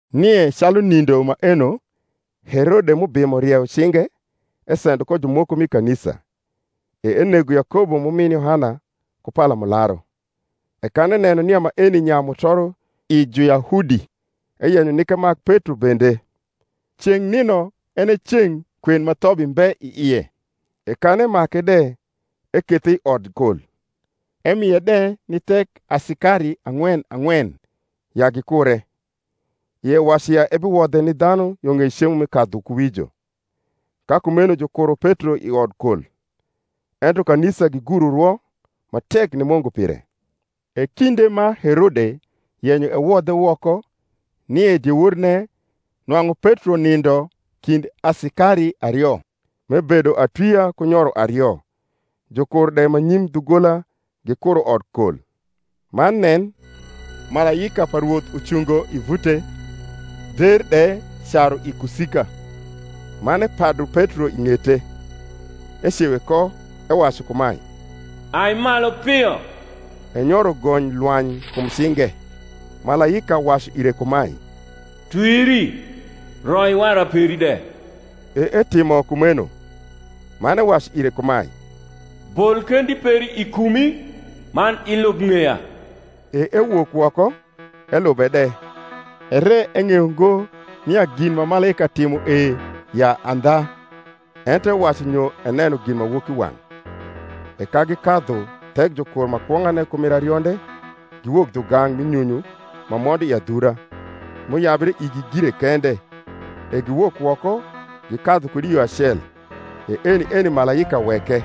Nie calu nindo maeno Herode m’ubimo rieyo cinge esendo ko jumoko mi kanisa. E enego Yakobo m’umin Yohana ku palamularu. E kan eneno nia maeni nyayu mutoro i Juyahudi, eyenyo nik emak Petro bende. Ceng’ nino en e ceng’ kwen ma thobi mbe i ie. E kan emake de, ekethe i odkol, emie de ni thek asikari ang’wen ang’wen ya gikure; ie wacu ya ebiwodhe ni dhanu yo ng’ei cemo mi Kadhukuwijo. Ka kumeno jukuro Petro i odkol: ento kanisa giguro rwo ma tek ni Mungu pire. E kinde ma Herode yenyo ewodhe woko, nie dieworne nwang’u Petro nindo kind asikari ario, m’ebedo atwia ku nyoro ario: jukur de ma nyim dhugola gikuro odkol. Man nen, malaika pa Rwoth ucungo i vute, der de caru i kusika: man epadu Petro i ng’ete, ecewe ko, ewacu kumae, Ai malu pio. E nyoro gony lwany kum cinge. Malaika wacu ire kumae, Twiri, roi wara peri de. E etimo kumeno. Man ewacu ire kumae, Bol kendi peri i kumi, man ilub ng’eya. E ewok woko, elube de; ere eng’eyo ngo nia gin ma malaika timo e ya andha, ento ewacu nyo eneno ginmawokiwang’. E ka gikadhu thek jukur ma kwong’ane ku mir arionde, giwok dhugang’ mi nyunyu ma mondo i adhura; m’uyabre igi gire kende: e giwok woko, gikadhu kud i yo acel: e eni eni malaika weke.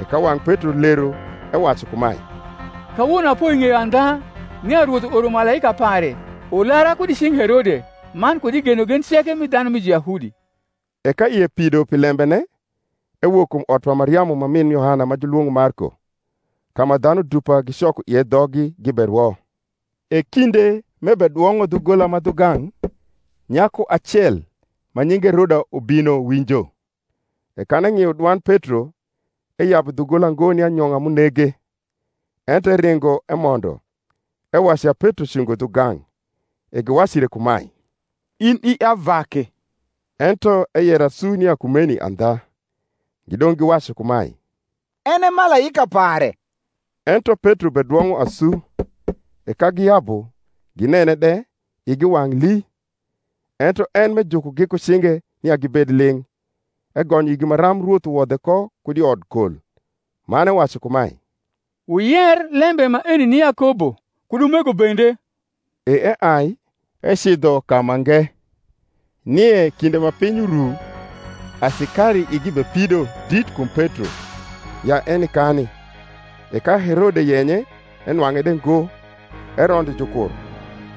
E ka wang’ Petro lero, ewacu kumae, Kawono apoi ng’eyo andha, nia Rwoth uoro malaika pare ulara kud i cing’ Herode, man kud i genogen ceke mi dhanu mi Juyahudi. E ka ie pido pi lembene, ewok kum ot pa Mariamu ma min Yohana ma julwong’o Marko; ka ma dhanu dupa gicoko ie dhoggi giberwo. E kinde m’ebedwong’o dhugola ma dhugang’, nyaku acel ma nyinge Roda ubino winjo. E kan eng’io dwand Petro, eyabu dhugola ngo ni anyong’a m’unege, ento eringo emondo, ewacu ya Petro cungo dhugang’. E giwacu ire kumae, In i avake. Ento eyero asu nia kumeni andha. Gidong’ giwacu kumae, En e malaika pare. Ento Petro bedwong’o asu: e ka giyabu, ginene de, igi wang’ lii. Ento en, m’ejukogi ku cinge nia gibed ling’, egonyo igi maram Rwoth uwodhe ko kud i odkol. Man ewacu kumae, Wuyer lembe maeni ni Yakobo, kud umego bende. E eai, ecidho kamange. Nie kinde ma piny uru, asikari igi bepido dit kum Petro, ya eni kani. E ka Herode yenye, enwang’e de ngo, erondo jukur,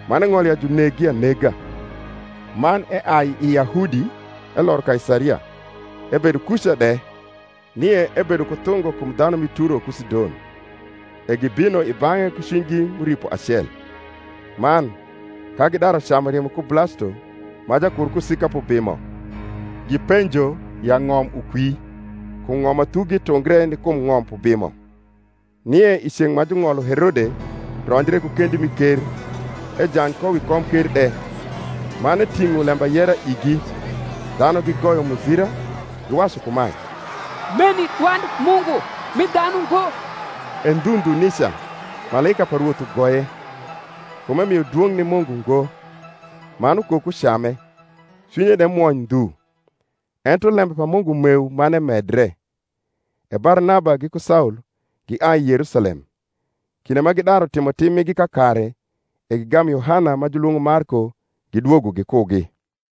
man eng’olo ya juneggi anega. Man eai i Yahudi eloro Kaisaria, ebedo kuca de. Nie ebedo ku thungo kum dhanu mi Turo ku Sidon: e gibino i bang’e ku cwinygi m’uripo acel, man, ka gidaru camu rimo ku Blasto majakur kusika p’ubimo, gipenjo ya ng’om ukwi, kum ng’om ma thugi tungre ni kum ng’om p’ubimo. Nie i ceng’ ma jung’olo Herode ronjre ku kendi mi ker, ejany ko wi komker de, man eting’o lembayera igi. Dhanu gigoyo muzira, giwacu kumae, Meni dwand mungu, mi dhanu ngo. E ndhu ndhu nica malaika pa Rwoth ugoye, kum emio dwong’ ni Mungu ngo: man ukoko came, cwinye de mwony ndhu. Ento lembe pa Mungu meu man emedre. E Barnaba giku Saul giai Yerusalem, kinde ma gidaru timotim migi kakare, e gigamu Yohana ma julwong’o Marko gidwogo gikugi.